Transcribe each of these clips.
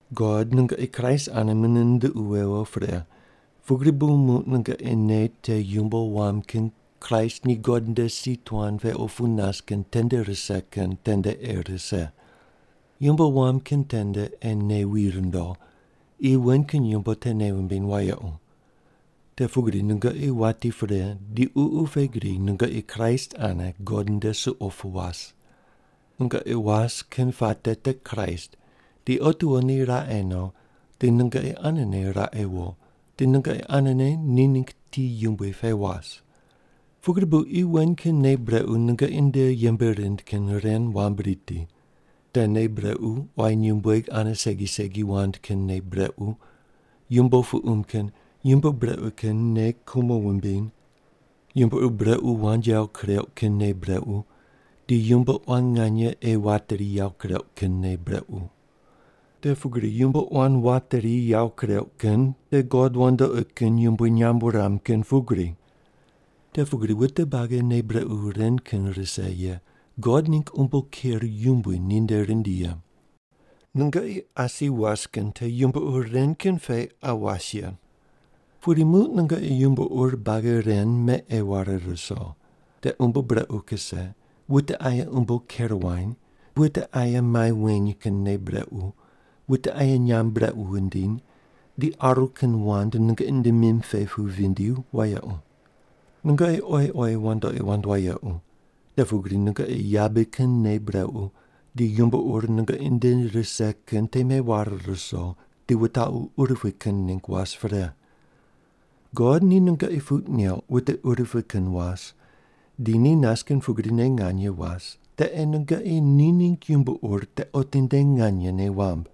God nungoqi Kraist ane mune nunduqu wewo pre, pugri bu muq nungoqi nei te yumbo wam kin Kraist ni God nde si tuan pe opu nas kin tende rise kin tende ei rise. Yumbo wam kin tende ei nei wi rundo, qi wen kin yumbo te nei wumbiny wayequ. Te pugri nungoqi wati pre di ququ pe gri nungoqi Kraist ane God nde suqo pu was. Nungoqi was kin puate te Kraist, di otiwo ni raqe no di nungoqi anene raqe wo, di nungoqi anene ni ningg ti yumbui pe was. Pugri bu qi wen kin nei brequ nungoqi nde yembe rind kin ren wambui riti. Te nei brequ quayi nyumbueg ane segi segi wand kin nei brequ, yumbo puqum kin, yumbo brequ kin nei kumo wumbiny, yumbo ur brequ wand yawo kureuq kin nei brequ, di yumbo quan nganye ei wateri yawo kureuq kin nei brequ. Te pugri yumbo quan wateri yawo kureuq kin te god wandoqi kin yumbui nyamb wuram kin pugri. Te pugri wute buagi nei brequ ren kin rise ye God ningg umbo ker yumbui ninde rindi ye. Nungoqi asi was kin te yumbo ur ren kin pe qa was ye. Pudi muq nungoqi yumbo ur buagi ren me ei ware ruso: Te umbo brequ kuse, wute aye umbo ker wany, wute aye mai weny kin nei brequ, wute aye nyamb brequ wundiny, di aru kin wand nungoqi nde mim pe pu vindi wayequ. Nungoqi oyi oyi wandoqi wand wayequ, te pugri nungoqi yabe kin nei brequ di yumbo ur nungoqi nde rise kin te meware ruso, di wutaqu urupui kin ningg was pre. God ni nungoqi puq neuq wute urupui kin was di ni nas kin pugrine nganye was te ei nungoqi ni ningg yumbo ur te otinde nganye nei wamb.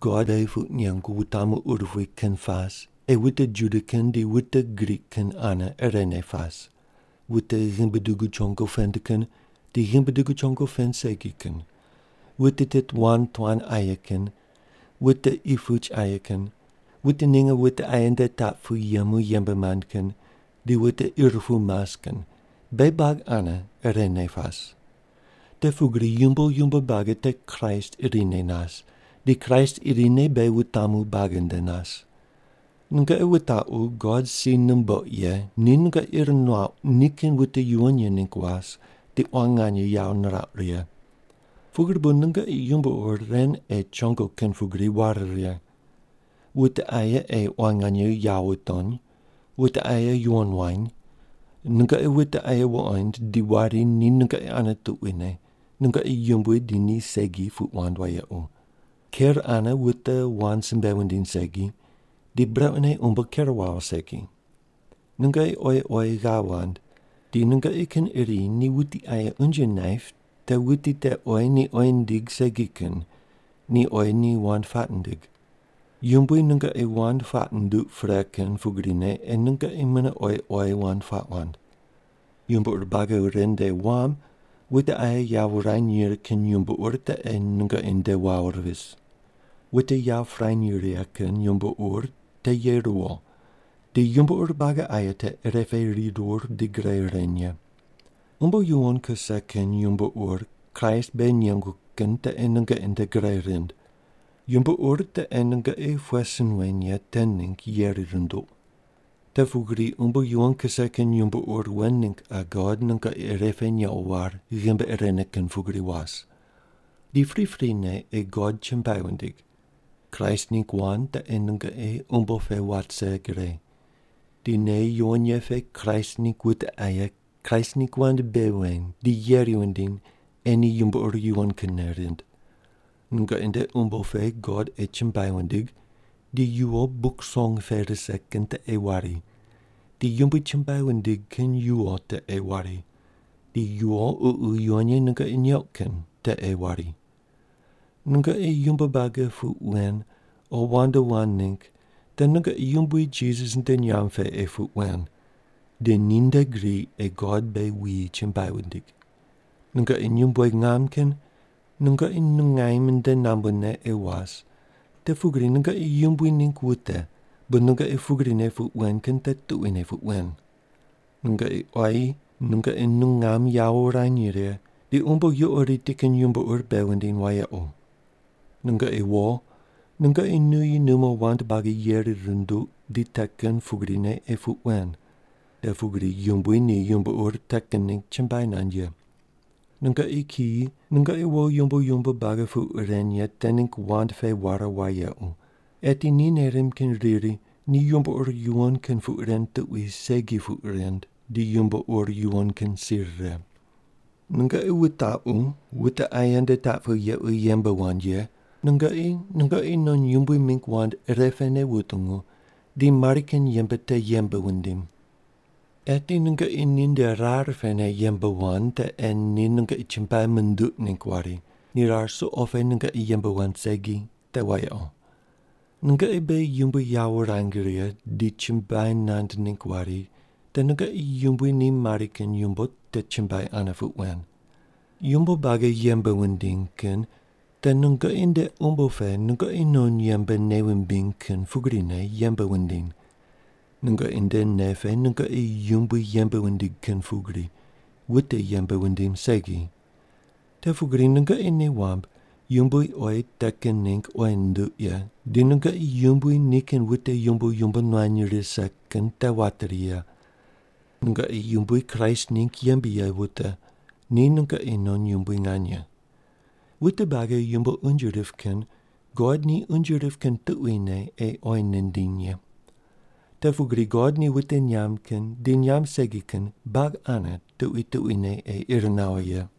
God beghi puq nengu wutamu urupui kin pas ei wute Juda kin di wute Grik kin ane irene pas, wute ghimbi dugu chongo pend kin di ghimbi dugu chongo pend segi kin, wute tit wand tuan aye kin, wute qi puch aye kin, wute ninge wute aye nde taq pu yemu yembe mand kin di wute ir pu mas kin beghi buagi ane irene pas. Te pugri yumbo yumbo buagi te Kraist irine nas, di Kraist irine beghi wutamu buagi nde nas. Nungoqi wutaqu God si numbouq ye ni nungoqi ir nuaqu nikin wute yuwon ye ningg was di quan nganye yawo nirauq righe. Pugri bu nungoqi yumbo ur ren ei chongo kin pugri ware righe: Wute aye ei quan nganye yawo wutony, wute aye yuwon wany, nungoqi wute aye wuqond di wari ni nungoqi ane tuquine, nungoqi yumbui di ni segi puq wand wayequ, ker ane wute wand simbe wundiny segi, di brequne umbo ker wawo segi. Nungoqi oyi oyi ghav wand, di nungoqi kin iri ni wuti aye unje naip te wuti te oyi ni oyi nindig segi kin, ni oyi ni wand puaq nindig. Yumbui nungoqi wand puaq nunduq pre kin pugrine ei nungoqi mune oyi oyi wand puaq wand. Yumbo ur buagi ren nde wam wute aye yawo wurany righe kin yumbo ur te ei nungoqi nde wawo vis. Wute yawo pirany righe kin yumbo ur te ye ruwo di yumbo ur buagi aye te irepe rirur di gre reny ye. Umbo yuwon kuse kin yumbo ur Kraist beghi nengu kin te ei nungoqi nde gre rind. Yumbo ur te ei nungoqi pughe sin wen ye te ningg yeri runduq. Te pugri umbo yuwon kuse kin yumbo ur wen ningg qa God nungoqi irepe nequ war ghimbi irene kin pugri was. Di priprine ei God chumbuai wundig. Kraist ningg wand te ei nungoqi umbo pe wat vise gre. Di nei yuwon ye pe Kraist ningg wute aye Kraist ningg wand bei weny di yeri wundiny ei ni yumbo ur yuwon kinne rind. Nungoqi nde umbo pe God ei chumbuai wundig di yuwo Buk Song pe rise kin te ei wari, di Yumbui chumbuai wundig kin yuwo te ei wari, di yuwo Ququ Yuwon Ye nungoqi neuq kin te ei wari. Nungoqi yumbo buagi puq wen o wand wand ningg te nungoqi Yumbui Jisas nde nyamb pe ei puq wen, di ninde gri ei God beghi wuyi chumbuai wundig. Nungoqi nyumbueg ngam kin nungoqi nungaim nde nambune ei was, te pugri nungoqi Yumbui ningg wute bu nungoqi pugrine puq wen kin te tuquine puq wen. Nungoqi quayi nungoqi nungam yawo wurany righe, ni umbo yuqo riti kin yumbo ur bei wundiny wayequ. Nungoqi wo nungoqi nuyi numo wand buagi yeri runduq di te kin pugrine ei puq wen. Te pugri Yumbui ni yumbo ur te kin ningg chumbuai nand ye. Nungoqi kiyi nungoqi wo yumbo yumbo buagi puq ren ye te ningg wand pe ware wayequ, eti ni nei rimb kin riri ni yumbo ur yuwon kin puq ren tuqui segi puq rind di yumbo ur yuwon kin si rire. Nungoqi wutaqu wute aye nde taq pu yequ yembe wand ye nungoqi nungoqi non yumbui mingg wand irepene wutungu di mari kin yembe te yembe wundim. Eti nungoqi ninde rar pene yembe wand te ei ni nungoqi chumbuai munduq ningg wari, ni rar suqo pe nungoqi yembe wand segi, te wayequ. Nungoqi beghi Yumbui yawo wurang righe di chumbuai nand ningg wari te nungoqi yumbui ni mari kin yumbo te chumbuai ane puq wen. Yumbo buagi yembe wundiny kin te nungoqi nde umbo pe nungoqi non yembe nei wumbiny kin pugrine yembe wundiny. Nungoqi nde nei pe nungoqi Yumbui yembe wundig kin pugri, wute yembe wundim segi. Te pugri nungoqi nei wamb Yumbui oyi te kin ningg oyi nunduq ye di nungoqi Yumbui nikin wute yumbo yumbo nuany rise kin te wateri ye. Nungoqi Yumbui Kraist ningg yembe ye wute, ni nungoqi non yumbui nganye. Wute buagi yumbo unje rip kin God ni unje rip kin tuquine ei oyi nindiny ye. Te pugri God ni wute nyamb kin di nyamb segi kin buagi ane tuqui tuquine ei ir nawo ye.